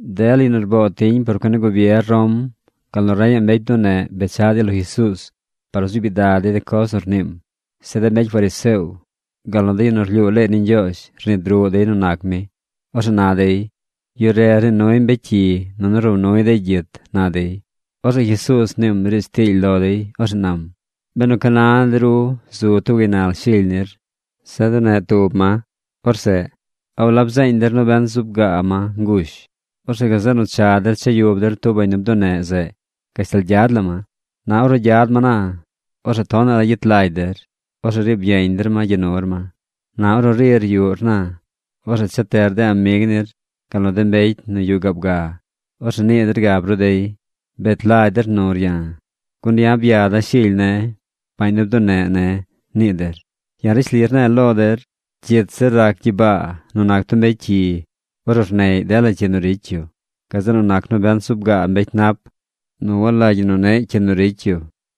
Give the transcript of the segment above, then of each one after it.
Dela yu nu rboo tiñ por cuen ni gubier Rom, gal nu reñaꞌ mbecy bduneꞌ bechaꞌ dey lo Jesuuz par nu zuub gyidag dey de coz nu rniim. Zeꞌ de mbecy fariseo gal nu de yu nu rlyuu leey ni Ñgyoozh rnid ruꞌ dey nu nac mi. Orzeꞌ na dey: ―Yu re rnii nuy mbecy cyi nunu row nuy dey gyit ―na dey. Orzeꞌ Jesuuz mniim riidz tiily lo dey. Orzeꞌ nam: ―Benu ca na de ru zu tub gaynal shily nir, seꞌ duneꞌ tub ma, orzeꞌ ¿a walab zeeñ der nobent zuub gaa ma ngush? Orzeꞌ gazeꞌ nu cha der cha yub der tub bañ nu bduneꞌ zeꞌ gashtal gyad la ma. Na ornu gyad ma na, orzeꞌ tonaꞌ la gyet lagy der. Orzeꞌ riib yeñ der ma gya nur ma. Na ornu rir yuꞌr na, orzeꞌ cha teꞌr de amig nir gal nu de mbecy nu yuꞌ gaab ga. Orzeꞌ nii der gab ru dey: “Bet lagy der nur ya̱, gun ya̱ byada̱ shily ne̱, bañ nu bduneꞌ”, nii der. Ya̱ rishli rne̱e̱ lo der, cyit zir rac gyibaa nu nac tub mbecy cyi ornu rneꞌy dela cyi nu ricy yu, gazeꞌ nu nac nobent zub gaa mbecy nap nu walagy ñi nu neꞌ cyi nu ricy yu.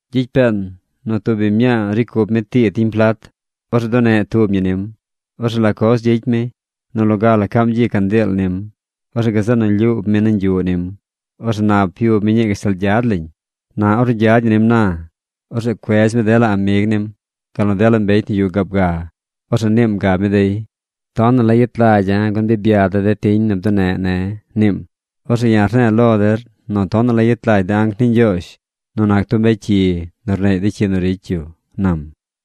’Gyicy peen nu tub biñ mñaa nu ricy cup tii tiñ plat. Orzeꞌ duneꞌ tub ñi nim. Orzeꞌ ¿la coz gyicy mi? Nu loga la caam gyi candiil nim. Orzeꞌ gazeꞌ nu lyuub mi nañ yuꞌ nim. Orzeꞌ nap yub mi ñii gashtal gyad lañ. Na ornu gyad ñi nim na, orzeꞌ cuedz mi dela amig nim, gal nu dela mbecy nu yuꞌ gaab ga. Orzeꞌ niim gab mi dey: “Tonaꞌ la yet lagya̱ gun bi byada̱ de tiñ nu bduneꞌ ne̱”, niim. Orzeꞌ ya̱ rne̱e̱ lo der nu tonaꞌ la yet lagy de anc ni Ñgyoozh nu nac tub mbecy cyi nu rneꞌy de cyi nu ricy yu ―nam.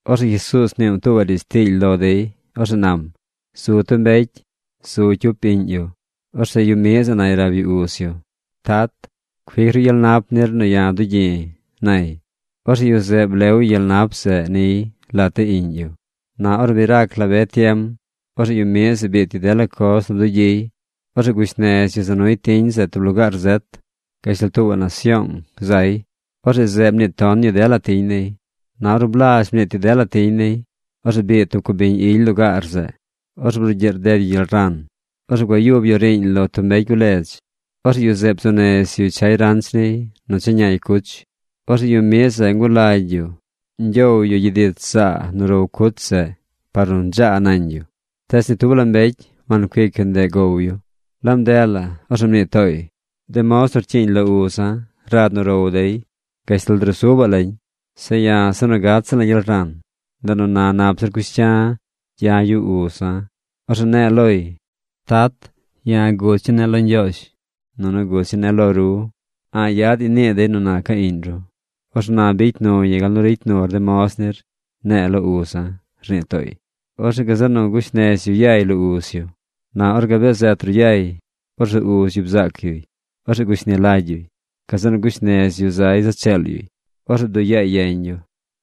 Orzeꞌ Jesuuz mniim tuubaꞌ riidz tiily lo dey. Orzeꞌ nam: ―Zu tub mbecy. Zu cyup iꞌñ yu. Orzeꞌ yu miꞌ zeꞌ nay rab yu uz yu: “Tat, cuic ru gyel nap nir nu ya̱ dugyi̱”, nay. Orzeꞌ yu zeꞌ blew yu gyel nap zeꞌ niy lat de iꞌñ yu. Na ornu bi rac la be tiem, orzeꞌ yu miꞌ zeꞌ biit yu dela coz nu bdugyiy. Orzeꞌ gush nez yu za nuy tiñ zeꞌ tub lugaar zet. Gashtal tuubaꞌ nasyoong zay. Orzeꞌ zeꞌ mniit ton yu dela tiñ niy. Na ornu blazh mniit yu dela tiñ niy, orzeꞌ biid tub cubiñ ily lugaar zeꞌ. Orzeꞌ brugyiꞌ rded yu gyel ran. Orzeꞌ gua yub yu riiñ lo tub mbecy guledz. Orzeꞌ yu zeꞌ bzuu nez yuy chay ranch niy nu cha ñay cuch. Orzeꞌ yu miꞌ zeꞌ ngulagy yu ñgyow yu gyid ich zaa nu row cuch zeꞌ par nu dzaa nañ yu. Tees ni tub la mbecy wancuic yu ndeꞌ gow yu. Laab ndeꞌ la orzeꞌ mnii tooy: “De moz nu rcyiiñ lo uza̱ rad nu row dey gashtal drusubaꞌ lañ. Zeꞌ ya̱ se nu gat ziꞌla̱ gyel ran. Ndeꞌ nu na nap zir cush cya̱ gya̱ yuꞌ uza̱. Orzeꞌ ne̱e̱ loy: Tat, ya̱ guch ñii ne̱ lo Ñgyoozh, nunu guch ñii ne̱ lo ru. A̱ꞌ yadaꞌñ nu nii dey nu naca̱ iꞌñ ru. Orzeꞌ na bicy nu ya̱ gal nu ricy nur de moz nir, ne̱e̱ lo uza̱”, rnii tooy. Orzeꞌ gazeꞌ nu gush nez yu yay lo uz yu. ’Na ornu gabee zet yay, orzeꞌ uz yu bzaac yuy. Orzeꞌ gushni lagy yuy. Gazeꞌ nu gush nez yu zay za cheel yuy. Orzeꞌ bduꞌ yaay yeñ yu.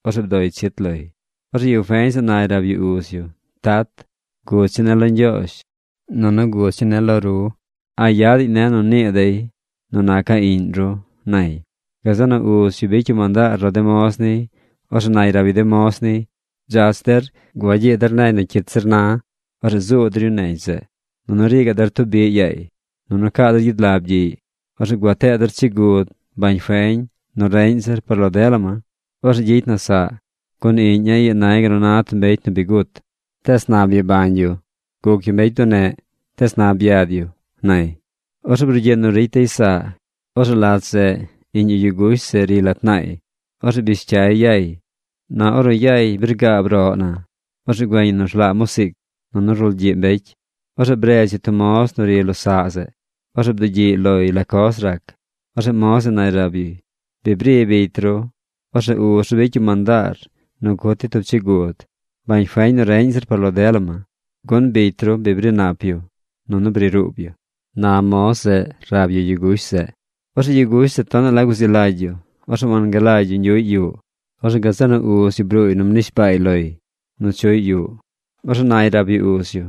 Orzeꞌ bdoy chit loy. Orzeꞌ yu feñ zeꞌ nay rab yu uz yu: “Tat, guch ñii ne̱ lo Ñgyoozh, nunu guch ñii ne̱ lo ru. A̱ꞌ yadaꞌñ ne̱ nu nii dey nu naca̱ iꞌñ ru”, nay. Gazeꞌ nu uz yu bicy yu mandaar lo de moz niy. Orzeꞌ nay rab yu de moz niy: “Dzach der, gua gyii der negy nu cyit zir na. Orzeꞌ zuu der yu negy zeꞌ. Nunu rii gaꞌ der tub biꞌ yaay. Nunu caa der gyid lab gyiꞌy. Orzeꞌ gua tee der chigud, bañ feñ nu reꞌñ zir par lo dela ma. Orzeꞌ gyicy na saꞌ. Gun iꞌña̱ ii nay gal nu na tub mbecy nu bi gut. Tees na byabañ yu. Guc yu mbecy bduneꞌ. Tees na byad yu”, nay. ¡Orzeꞌ brugyiꞌ nu ricy dey saꞌ! ’Orzeꞌ lat zeꞌ iꞌñ yu yu gush zeꞌ riy lat naay. Orzeꞌ bish cyay yay. Na ornu yay bi rgaab roꞌ na, orzeꞌ güeñ yu nu rlaa musiic. Nunu rulgyiꞌ mbecy. Orzeꞌ bredz yu tub moz nu ri lo saꞌ zeꞌ. Orzeꞌ bdugyiꞌy loy la coz rac. Orzeꞌ moz zeꞌ nay rab yuy: “Bi bri bicy ru. Orzeꞌ uz ru bicy yu mandaar nu cut dey tub chigud, bañ feñ nu reꞌñ zir par lo dela ma. Gun bicy ru bri nap yu, nunu bri ruub yu”, na moz zeꞌ rab yu yu gush zeꞌ. Orzeꞌ yu gush zeꞌ tonaꞌ la guzi lagy yu. Orzeꞌ wangalagy yu ñgyuꞌy yuꞌ. Orzeꞌ gazeꞌ nu uz yu bruuy nu mnishbaay loy nu chuꞌy yuꞌ. Orzeꞌ nay rab yu uz yu: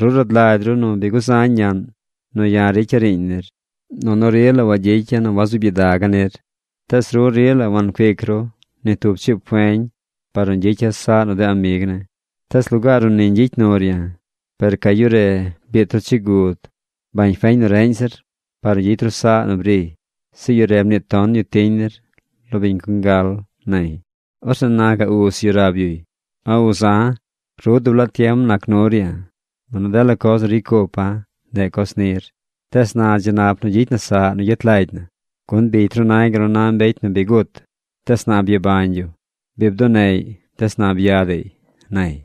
“Ru rad lagy ru nu bi guzañ ñaꞌn nu ya̱ ricya̱ riiñ nir. Nunu rila wangyicya̱ nu wazuub gyidaga̱ nir. Tees ru rila wancuic ru ni tub chiib feñ par nu ñgyicya̱ saꞌ nu de amig ne̱. Tees lugaar nu ni ñgyicy nur ya̱, per ca yu re biit ru chigud, bañ feñ nu reꞌñ zir par nu gyicy ru saꞌ nu briy. Zeꞌ yu re mniit ton yu tiñ nir lo de biñ congal”, nay. ’Orzeꞌ na gaꞌ uz yu rab yuy: “A uza, ru dub laa tiem nac nur ya̱, nunu dela coz nu ricy cupa̱, ndeꞌ coz nir. Tees na dzi nap nu gyicy na saꞌ nu gyet lagy na, gun bicy ru nay gal nu na tub mbecy nu bi gut. Tees na byabañ yu. Bi bduneꞌy, tees na byadaꞌy”, nay.